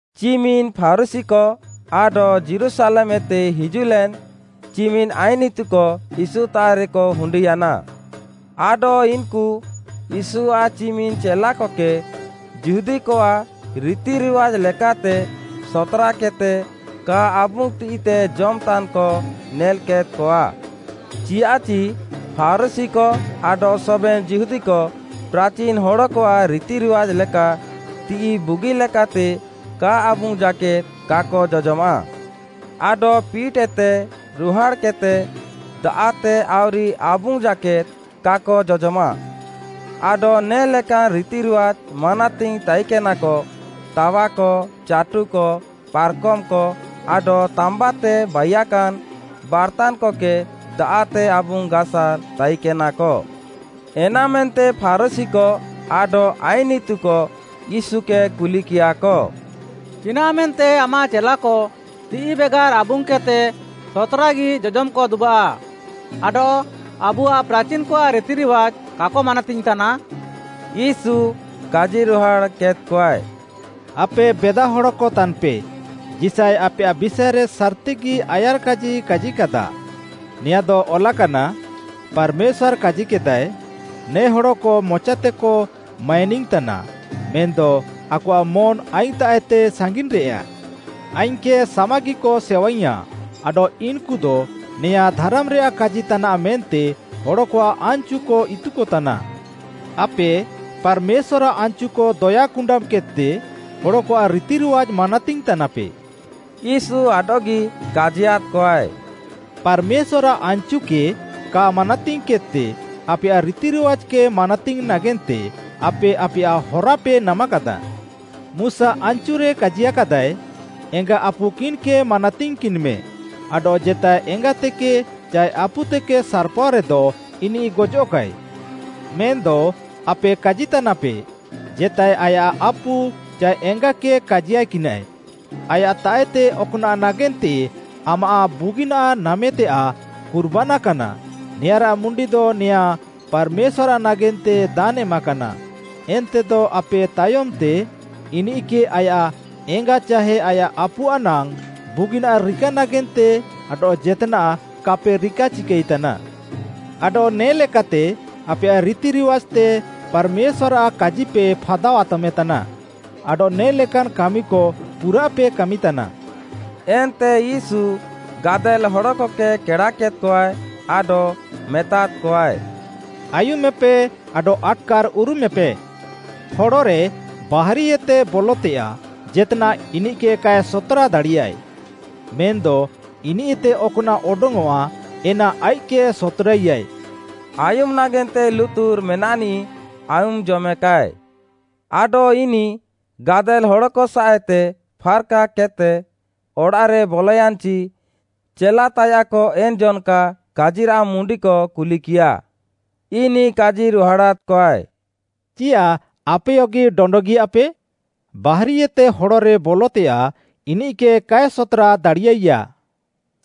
ଚିମିନ୍‌ ଫାରୁଶୀକ ଆଡଃ ଯୀରୁଶାଲେମ୍‌ଏତେ ହିଜୁଃଲେନ୍‌ ଚିମିନ୍‌ ଆଇନ୍‌ ଇତୁକ ୟୀଶୁତାଃରେକ ହୁଣ୍ଡିୟାନା। ଆଡଃ ଇନ୍‌କୁ ୟୀଶୁଆଃ ଚିମିନ୍‌ ଚେଲାକକେ ଯିହୁଦୀକଆଃ ରିତିରିୱାଜ୍‌ ଲେକାତେ ସତ୍‌ରାକେଦ୍‌ତେ କା ଆବୁଙ୍ଗ୍‌ ତିଃଇତେ ଜମ୍‌ତାନ୍‌କ ନେଲ୍‌କେଦ୍‌କଆ। ଚିୟାଃଚି ଫାରୁଶୀକ ଆଡଃ ସବେନ୍‌ ଯିହୁଦୀକ ପ୍ରାଚିନ୍‌ ହଡ଼କଆଃ ରିତିରିୱାଜ୍‌ ଲେକା ତିଃଇ ବୁଗିଲେକାତେ କା ଆବୁଙ୍ଗ୍‌ ଜାକେଦ୍‌ କାକ ଜଜମାଃ। ଆଡଃ ପିଟ୍‌ଏତେ ରୁହାଡ଼୍‌କେଦ୍‌ତେ ଦାଆଃ'ତେ ଆଉରି ଆବୁଙ୍ଗ୍‌ ଜାକେଦ୍‌ କାକ ଜଜମାଃ। ଆଡଃ ନେ'ଲେକାନ୍ ରିତିରିୱାଜ୍‌ ମାନାତିଙ୍ଗ୍‌ ତାଇକେନାକ, ତାୱାକ, ଚାଟୁକ, ପାର୍‌କମ୍‌କ, ଆଡଃ ତାମ୍ବାତେ ବାଇୟାକାନ୍ ବାର୍ତାନ୍‌କକେ ଦାଆଃତେ ଆବୁଙ୍ଗ୍‌ ଗାସାର୍ ତାଇକେନାକ। ଏନାମେନ୍ତେ ଫାରୁଶୀକ ଆଡଃ ଆଇନ୍‌ ଇତୁକ ୟୀଶୁକେ କୁଲିକିୟାକ, “ଚିନାଃମେନ୍ତେ ଆମାଃ ଚେଲାକ ତିଃଇ ବେଗାର୍‌ ଆବୁଙ୍ଗ୍‌କେଦ୍‌ତେ ସତ୍‌ରାଗି ଜଜମ୍‌କ ଦୁବାଃ ଆଡଃ ଆବୁଆଃ ପ୍ରାଚିନ୍‌କଆଃ ରିତିରିୱାଜ୍‌କ କାକ ମାନାତିଙ୍ଗ୍‌ତାନା?” ୟୀଶୁ କାଜିରୁହାଡ଼୍‌କେଦ୍‌କଆଏ, “ଆପେ ବେଦାହଡ଼କ ତାନ୍‌ପେ, ଯିଶାୟ ଆପେୟାଃ ବିଷାଏରେ ସାର୍‌ତିଗି ଆୟାର୍‌କାଜି କାଜିକାଦା, ନେଆଁଦ ଅଲାକାନା, “ପାର୍‌ମେଶ୍ୱାର୍‌ କାଜିକେଦାଏ, ‘ନେ ହଡ଼କ ମଚାତେକ ମାଇନିଙ୍ଗ୍‌ତାନା, ମେନ୍‌ଦ ଆକଆଃ ମନ୍‌ ଆଇଙ୍ଗ୍‌ତାଃଏତେ ସାଙ୍ଗିନ୍‌ରେଆ। ଆଇଙ୍ଗ୍‌କେ ସାମାଗିକ ସେୱାଇଙ୍ଗ୍‌ୟାଁ; ଆଡଃ ଇନ୍‌କୁଦ ନେୟାଁ ଧାରାମ୍‌ରେୟାଃ କାଜି ତାନାଃ ମେନ୍ତେ ହଡ଼କଆଃ ଆନାଚୁକ ଇତୁକତାନା।’ “ଆପେ ପାର୍‌ମେଶ୍ୱାର୍‌ରାଃ ଆନ୍‌ଚୁକ ଦୟା କୁଣ୍ଡାମ୍‌କେଦ୍‌ତେ ହଡ଼କଆଃ ରିତିରିୱାଜ୍‌ ମାନାତିଙ୍ଗ୍‌ ତାନାପେ।” ୟୀଶୁ ଆଡଃଗି କାଜିୟାଦ୍‌କଆଏ, “ପାର୍‌ମେଶ୍ୱାର୍‌ରାଃ ଆନ୍‌ଚୁକେ କା ମାନାତିଙ୍ଗ୍‌କେଦ୍‌ତେ ଆପେୟାଃ ରିତିରିୱାଜ୍‌କେ ମାନାତିଙ୍ଗ୍‌ ନାଗେନ୍ତେ ଆପେ ଆପେୟାଃ ହରାପେ ନାମାକାଦାଃ। ମୁଶା ଆନ୍‌ଚୁରେ କାଜିୟାକାଦାଏ, ‘ଏଙ୍ଗା ଆପୁ କିନ୍‌କେ ମାନାତିଙ୍ଗ୍‌କିନ୍‌ମେ’ ଆଡଃ ‘ଜେତାଏ ଏଙ୍ଗାତେକେ ଚାଏ ଆପୁତେକେ ସାର୍‌ପାଅ ରେଦ ଇନିଃ ଗଜଃକାଏ।’ ମେନ୍‌ଦ ଆପେ କାଜିତାନାପେ, ଜେତାଏ ଆୟାଃ ଆପୁ ଚାଏ ଏଙ୍ଗାକେ କାଜିୟାକିନାଏ, ଆୟାଃତାଃଏତେ ଅକ୍‌ନାଃ ନାଗେନ୍ତେ ଆମାଃ ବୁଗିନାଃ ନାମେତେୟାଃ ‘କୁର୍ବାନା’ କାନା, ନେଆଁଁରାଃ ମୁଣ୍ଡିଦ ନେୟାଁ ପାର୍‌ମେଶ୍ୱାର୍‌ ନାଗେନ୍ତେ ଦାନ୍‌ ଏମାକାନା, ଏନ୍ତେଦ ଆପେ ତାୟମ୍‌ତେ ଇନିଃକେ ଆୟାଃ ଏଙ୍ଗା ଚାହେ ଆୟାଃ ଆପୁଆଃ ନାଙ୍ଗ୍‌ ବୁଗିନାଃ ରିକା ନାଗେନ୍ତେ ଆଡଃ ଜେତ୍‌ନାଃ କାପେ ରିକାଚିକାଇତାନା। ଆଡଃ ନେ ଲେକାତେ ଆପେୟାଃ ରିତିରିୱାଜ୍‌ତେ ପାର୍‌ମେଶ୍ୱାର୍‌ରାଃ କାଜିପେ ଫାଦାଆତମେତାନା। ଆଡଃ ନେ ଲେକାନ୍ କାମିକ ପୁରାଃପେ କାମିତାନା।” ଏନ୍ତେ ୟୀଶୁ ଗାଦେଲ୍‌ ହଡ଼କକେ କେଡ଼ାକେଦ୍‌କଆଏ ଆଡଃ ମେତାଦ୍‌କଆଏ, “ଆୟୁମେପେ ଆଡଃ ଆଟ୍‌କାର୍‌ ଉରୁମେପେ। ହଡ଼ରେ ବାହାରିଏତେ ବଲଃତେୟାଃ ଜେତ୍‌ନାଃ ଇନିଃକେ କାଏ ସତ୍‌ରା ଦାଡ଼ିୟାଇଆ, ମେନ୍‌ଦ ଇନିଃତେ ଅକ୍‌ନାଃ ଅଡଙ୍ଗ୍‌ଅଃଆ ଏନା ଆଇଃକ୍‌କେ ସତ୍‌ରାଇଆଏ।” ଆୟୁମ୍‌ ନାଗେନ୍ତେ ଲୁତୁର୍‌ ମେନାଃନିଃ ଆୟୁମ୍‌ଜମେକାଏ। ଆଡଃ ଇନିଃ ଗାଦେଲ୍‌ ହଡ଼କସାଃଏତେ ଫାର୍‌କାକେଦ୍‌ତେ ଅଡ଼ାଃରେ ବଲୟାନ୍‌ଚି, ଚେଲାତାୟାଃକ ଏନ୍‌ ଜନ୍‌କା କାଜିରାଃ ମୁଣ୍ଡିକ କୁଲିକିୟାଃ। ଇନିଃ କାଜିରୁହାଡ଼ାଦ୍‌କଆଏ, “ଚିୟାଃ ଆପେୟଗି ଡଣ୍ଡଗିୟାପେ? ବାହାରିଏତେ ହଡ଼ରେ ବଲଃତେୟାଃ ଇନିଃକେ କାଏ ସତ୍‌ରା ଦାଡ଼ିୟାଇଆ।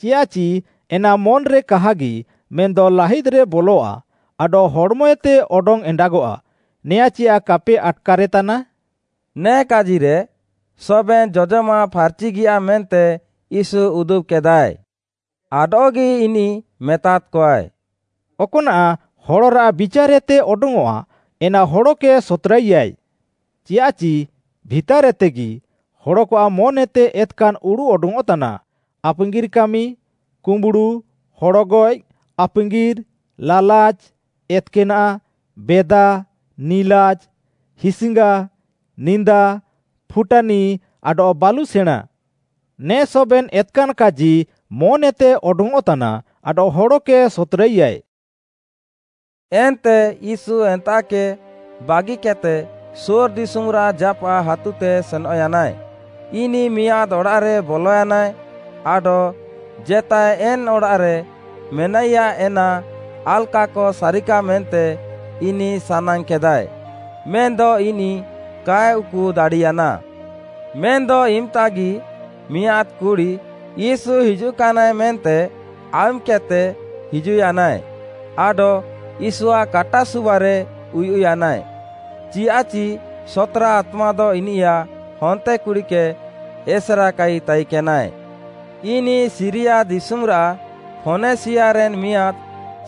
ଚିୟାଃଚି ଏନା ମନ୍‌ରେ କାହାଗି, ମେନ୍‌ଦ ଲାହିଦ୍‌ରେ ବଲଃଆ, ଆଡଃ ହଡ଼୍‌ମଏତେ ଅଡଙ୍ଗ୍‌ ଏଣ୍ଡାଗଆଃ, ନେୟାଁ ଚିୟାଃ କାପେ ଆଟ୍‌କାରେତାନା।” ନେ କାଜିରେ, ସବେନ୍‌ ଜଜମାଃ ଫାର୍‌ଚିଗିୟା ମେନ୍ତେ ୟୀଶୁ ଉଦୁବ୍‌କେଦାଏ। ଆଡଃଗି ଇନିଃ ମେତାଦ୍‌କଆଏ, “ଅକ୍‌ନାଃ ହଡ଼ରାଃ ବିଚାର୍‌ଏତେ ଅଡଙ୍ଗ୍‌ଅଃଆ, ଏନା ହଡ଼କେ ସତ୍‌ରାଇୟାଏ। ଚିୟାଃଚି ଭିତାର୍‌ଏତେଗି, ହଡ଼କଆଃ ମନ୍‌ଏତେ ଏତ୍‌କାନ୍‌ ଉଡ଼ୁଃ ଅଡଙ୍ଗ୍‌ଅଃତାନା, ଆପାଙ୍ଗିର୍‌ କାମି, କୁମ୍ବୁଡ଼ୁ, ହଡ଼ଗଏଃ, ଆପାଙ୍ଗିର୍‌, ଲାଲାଚ୍‌, ଏତ୍‌କାନାଃ, ବେଦା, ନିଲାଜ୍‌, ହିସ୍‌ଙ୍ଗା, ନିନ୍ଦା, ଫୁଟାନି ଆଡଃ ବାଲୁସେଣାଁଁ। ନେ ସବେନ୍‌ ଏତ୍‌କାନ୍‌ କାଜି ମନ୍‌ଏତେ ଅଡଙ୍ଗ୍‌ଅଃତାନା ଆଡଃ ହଡ଼କେ ସତ୍‌ରାଇଆଏ।” ଏନ୍ତେ ୟୀଶୁ ଏନ୍ତାଃକେ ବାଗିକେଦ୍‌ତେ ସୋର୍‌ ଦିଶୁମ୍‌ରାଃ ଜାପାଃ ହାତୁତେ ସେନଃୟାନାଏ। ଇନିଃ ମିଆଁଦ୍‌ ଅଡ଼ାଃରେ ବଲୟାନାଏ ଆଡଃ ଜେତାଏ ଏନ୍‌ ଅଡ଼ାଃରେ ମେନାଇୟା ଏନା ଆଲକାକ ସାରିକା ମେନ୍ତେ ଇନିଃ ସାନାଙ୍ଗ୍‌କେଦାଏ, ମେନ୍‌ଦ ଇନିଃ କାଏ ଉକୁ ଦାଡ଼ିୟାନା। ମେନ୍‌ଦ ଇମ୍‌ତାଗି ମିଆଁଦ୍‌ କୁଡ଼ି, ୟୀଶୁ ହିଜୁଃକାନାଏ ମେନ୍ତେ ଆୟୁମ୍‌କେଦ୍‌ତେ ହିଜୁଃୟାନାଏ ଆଡଃ ୟୀଶୁଆଃ କାଟାସୁବାରେ ଉୟୁଃୟାନାଏ, ଚିୟାଃଚି ସତ୍‌ରା ଆତ୍ମାଦ ଇନିୟାଃ ହନ୍ତେକୁଡ଼ିକେ ଏସେରାକାଇ ତାଇକେନାଏ। ଇନିଃ ସିରିୟା ଦିଶୁମ୍‌ରାଃ ଫୋନେସିୟାରେନ୍‌ ମିଆଁଦ୍‌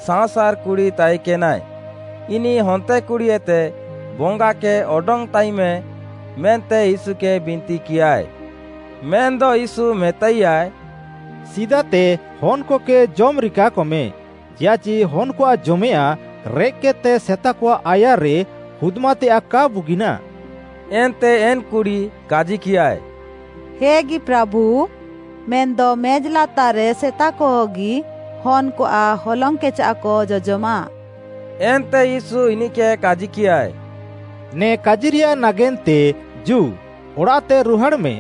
ସାଅଁସାର୍‌ କୁଡ଼ି ତାଇକେନାଏ, ଇନିଃ ହନ୍ତେକୁଡ଼ିଏତେ ବଙ୍ଗାକେ ହାର୍‌ଅଡଙ୍ଗ୍‌ତାଇମେ ମେନ୍ତେ ୟୀଶୁକେ ବିନ୍ତିକିୟାଏ। ମେନ୍‌ଦ ୟୀଶୁ ମେତାଇୟାଏ, “ସିଦାତେ ହନ୍‌କକେ ଜମ୍‌ ରିକାକମେ, ଚିୟାଃଚି ହନ୍‌କଆଃ ଜମେୟାଃଁ ରେଃକ୍‌କେଦ୍‌ତେ ସେତାକଆଃ ଆୟାର୍‌ରେ ହୁଦ୍‌ମାତେୟାଃ କା ବୁଗିନାଃ।” ଏନ୍ତେ ଏନ୍‌ କୁଡ଼ି କାଜିକିୟାଏ, “ହେଗି ପ୍ରାଭୁ, ମେନ୍‌ଦ ମେଜ୍‌ ଲାତାର୍‌ରେ ସେତାକହଗି ହନ୍‌କଆଃ ହଲଙ୍ଗ୍‌କେଚାଃକ ଜଜମାଃ।” ଏନ୍ତେ ୟୀଶୁ ଇନିଃକେ କାଜିକିୟାଏ, “ନେ କାଜିରେୟାଃ ନାଗେନ୍ତେ ଜୁ, ଅଡ଼ାଃତେ ରୁହାଡ଼୍‌ମେଁ,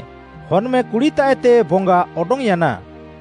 ହନ୍‌ମେଁ କୁଡ଼ିତାଃଏତେ ବଙ୍ଗା ଅଡଙ୍ଗ୍‌ୟାନା।”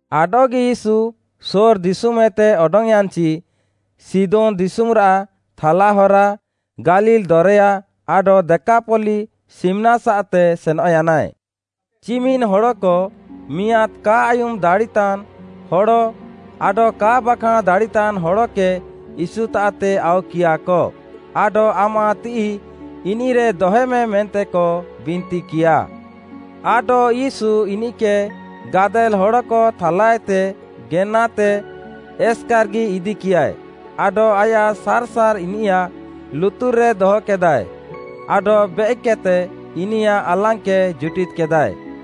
ଆଡଃଗି ୟୀଶୁ ସୋର୍‌ ଦିଶୁମ୍‌ଏତେ ଅଡଙ୍ଗ୍‌ୟାନ୍‌ଚି, ସିଦୋନ୍‌ ଦିଶୁମ୍‌ରାଃ ଥାଲା ହରା, ଗାଲିଲ୍‌ ଦରେୟା, ଆଡଃ ଦେକାପଲ୍ଲୀ ସିମ୍‌ନାସାଃତେ ସେନଃୟାନାଏ। ଚିମିନ୍‌ ହଡ଼କ ମିଆଁଦ୍‌ କା ଆୟୁମ୍‌ ଦାଡ଼ିତାନ୍‌ ହଡ଼ ଆଡଃ କା ବାଖାଁଣ୍‌ ଦାଡ଼ିତାନ୍‌ ହଡ଼କେ ୟୀଶୁତାଃତେ ଆଉକିୟାଃକ, ଆଡଃ ଆମାଃ ତିଃଇ ଇନିଃରେ ଦହେମେ ମେନ୍ତେକ ବିନ୍ତିକିୟା। ଆଡଃ ୟୀଶୁ ଇନିଃକେ ଗାଦେଲ୍‌ ହଡ଼କ ଥାଲାଏତେ ଗେନାତେ ଏସ୍‌କାର୍‌ଗି ଇଦିକିୟାଏ, ଆଡଃ ଆୟାଃ ସାର୍‌ସାର୍‌ ଇନିୟାଃ ଲୁତୁର୍‌ରେ ଦହକେଦାଏ, ଆଡଃ ବେଏକ୍‌କେଦ୍‌ତେ ଇନିୟାଃ ଆଲାଙ୍ଗ୍‌କେ ଜୁଟିଦ୍‌କେଦାଏ।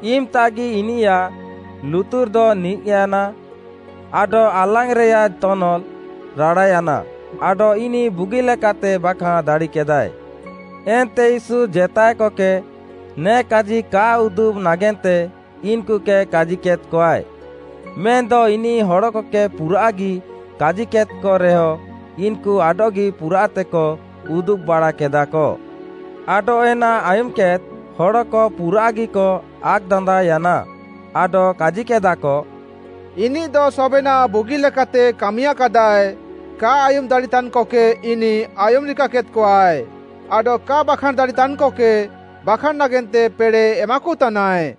ଇମ୍‌ତାଗି ଇନିୟାଃ ଲୁତୁର୍‌ଦ ନିଜ୍‌ୟାନା ଆଡଃ ଆଲାଙ୍ଗ୍‌ରେୟାଃ ତନଲ୍‌ ରାଡ଼ାୟାନା, ଆଡଃ ଇନିଃ ବୁଗିଲେକାତେ ବାଖାଁଣ୍‌ ଦାଡ଼ିକେଦାଏ। ଏନ୍ତେ ୟୀଶୁ ଜେତାଏକକେ ନେ କାଜି କା ଉଦୁବ୍‌ ନାଗେନ୍ତେ ଇନ୍‌କୁକେ କାଜିକେଦ୍‌କଆଏ, ମେନ୍‌ଦ ଇନିଃ ହଡ଼କକେ ପୁରାଃଗି କାଜିକେଦ୍‌କରେହ ଇନ୍‌କୁ ଆଡଃଗି ପୁରାଃତେକ ଉଦୁବ୍‌ବାଡ଼ାକେଦା। ଆଡଃ ଏନା ଆୟୁମ୍‌କେଦ୍‌ ହଡ଼କ ପୁରାଃଗିକ ଆକ୍‌ଦାନ୍ଦାଅୟାନା, ଆଡଃ କାଜିକେଦାଃକ, “ଇନିଃଦ ସବେନାଃ ବୁଗିଲେକାତେ କାମିୟାକାଦାଏ, କା ଆୟୁମ୍‌ଦାଡ଼ିତାନ୍‌କକେ ଇନିଃ ଆୟୁମ୍‌ ରିକାକେଦ୍‌କଆଏ, ଆଡଃ କା ବାଖାଁଣ୍‌ଦାଡ଼ିତାନ୍‌କକେ ବାଖାଁଣ୍‌ ନାଗେନ୍ତେ ପେଡ଼େଃ ଏମାକୁତାନାଏ।”